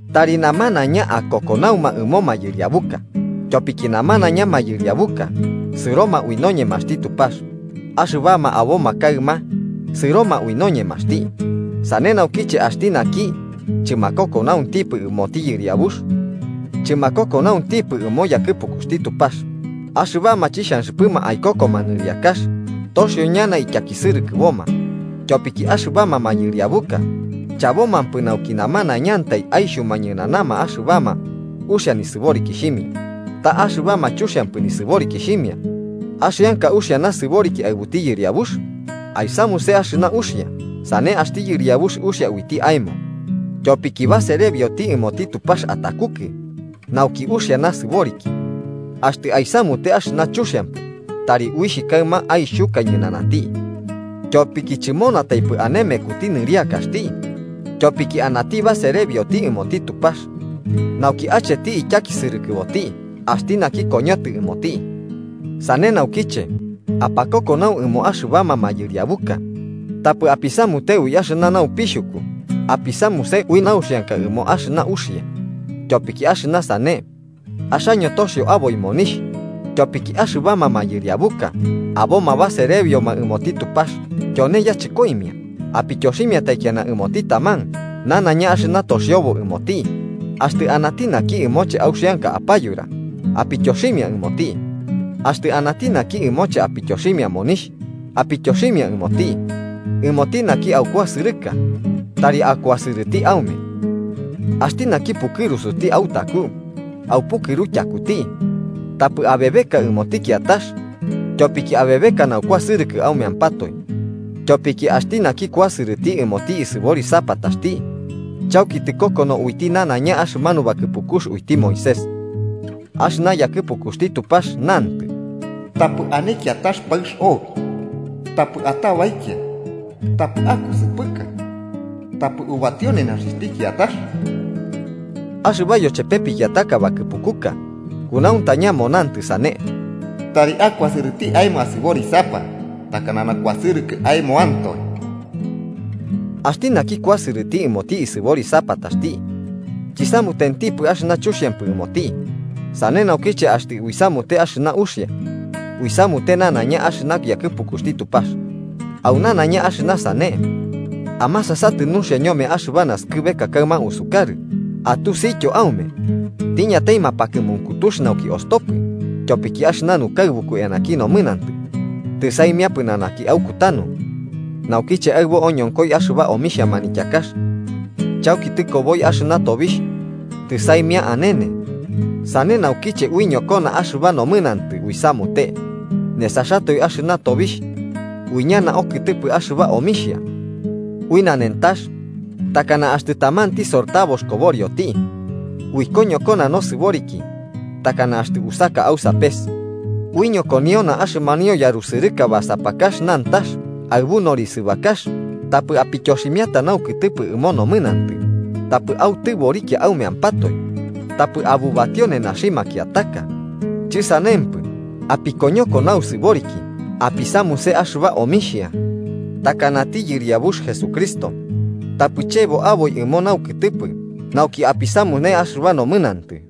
Tari namanaiña akokonauma ɨmo mayɨriabuka, tyopiki namanaiña mayɨriabuka sɨroma ui noñemaxti Tupax, axɨbama aboma kaɨma sɨroma ui noñemaxti. Sane naukiche axti naki chɨmakokonauntipɨ ɨmoti yɨriabux, chɨmakokonauntipɨ ɨmo yakɨpukuxti Tupax. Axɨbama chixhanxɨpɨma aikokoma nɨriakax toxio ñana ityakisɨrɨkɨboma. Tyopiki axɨbama mayɨriabuka chabomapɨ nauki namanaiñantai aixhuma ñɨnanama axɨbama uxia nisɨborikixhimia, ta axɨbama chuxiampɨ nisɨborikixhimia. ¿Axianka uxia nasɨboriki aɨbuti yɨriabux? Aisamuse axɨna uxia, sane axti yɨriabux uxia uiti aemo. Tyopiki baserebioti ɨmoti Tupax atakukɨ nauki uxia nasɨboriki. Axtɨ aisamute axɨna chuxiampɨ, tari uixh kaɨma aixhuka ñɨnanati. Tyopiki chɨmunataipɨ ane mekuti nɨriakaxti tyopiki anati baserebioti ɨmoti Tupax, nauki acheti ityakisɨrɨkɨboti axti naki koñotɨ ɨmoti. Sane naukiche apakokonau ɨmo axɨbama mayɨriabuka, tapɨ apisamute ui axɨna naupixhuku apisamuse ui nauxianka ɨmo axɨna uxia. Tyopiki axɨna sane axaño toxio aboi monixh. Tyopiki axɨbama mayɨriabuka aboma baserebioma ɨmoti Tupax, tyone yachɨkoimia. Apityoximia taikiana ɨmoti taman nanaiña axɨna toxiobo ɨmoti. Axtɨ anati naki ɨmoche auxianka apayura apityoximia ɨmoti, axtɨ anati naki ɨmoche apityoximia monixh apityoximia ɨmoti. Ɨmoti naki aukuasɨrɨka tari akuasɨrɨti aume, axti naki pukɨrusuti autaku aupukɨru tyakuti. Tapɨ abebeka ɨmoti kiatax, tyopiki abebeka naukuasɨrɨkɨ aumeampatoe. Tyopiki axti naki kuasɨrɨti ɨmoti isɨborisapataxti chauki tɨkokono uiti nanaiña axɨmanu bakɨpukux uiti Moisés. Axɨna yakɨpukuxti Tupax nantɨ: “Tapɨ ane kiatax paɨx obi, tapɨ atabaikia, tapɨ akusɨpɨka, tapɨ ubatio nenaxixhti kiatax.” Axɨba yochepe pikiataka bakɨpukuka kunauntaña monantɨ sane: “Tari akuasɨrɨti aemo asɨborisapa takana nakuasɨrɨkɨ aemoantoe.” Axti naki kuasɨrɨti ɨmoti isɨborisapataxti chisamutentipɨ axɨna chuxiampɨ ɨmoti, sane naukiche axtɨ uisamute axɨna uxia uisamute nanaiña axɨna yakɨpukuxti Tupax. Au nanaiña axɨna sane amasasatɨ nuxia ñome axɨba naskɨbeka kaɨma usukarɨ, atusityo aume tiñatai mapakɨmunkutux nauki ostopɨ. Tyopiki axɨna nukaɨbuku eanaki nomɨnantɨ tɨsaimia pɨnanaki aukutanu naukiche aɨbo oñonkoi axɨba omixha manityakax. Chauki tɨkoboi axɨna tobixh tɨsaimia anene. Sane naukiche uiñokona axɨba nomɨnantɨ uisamute nesaxatoe axɨna tobixh, uiñana okɨtɨpɨ axɨba omixhia ui nanentax takana axtɨ tamanti sortabox koborioti. Uikoñokona nosɨboriki takana axtɨ usaka au sapes. Uiñokoniona axɨmanio yarusɨrɨka basapakax nantax aɨbu norisɨbakax, tapɨ apityoximiata naukɨtɨpɨ ɨmo nomɨnantɨ, tapɨ autɨborikia aumeampatoe tapɨ abubatio nenaxi makiataka. Chɨsanempɨ, apikoñoko nausɨboriki apisamuse axɨba omixhia takanati Yɨriabux Jesucristo, tapɨ chebo aboi ɨmo naukɨtɨpɨ nauki apisamune axɨba nomɨnantɨ.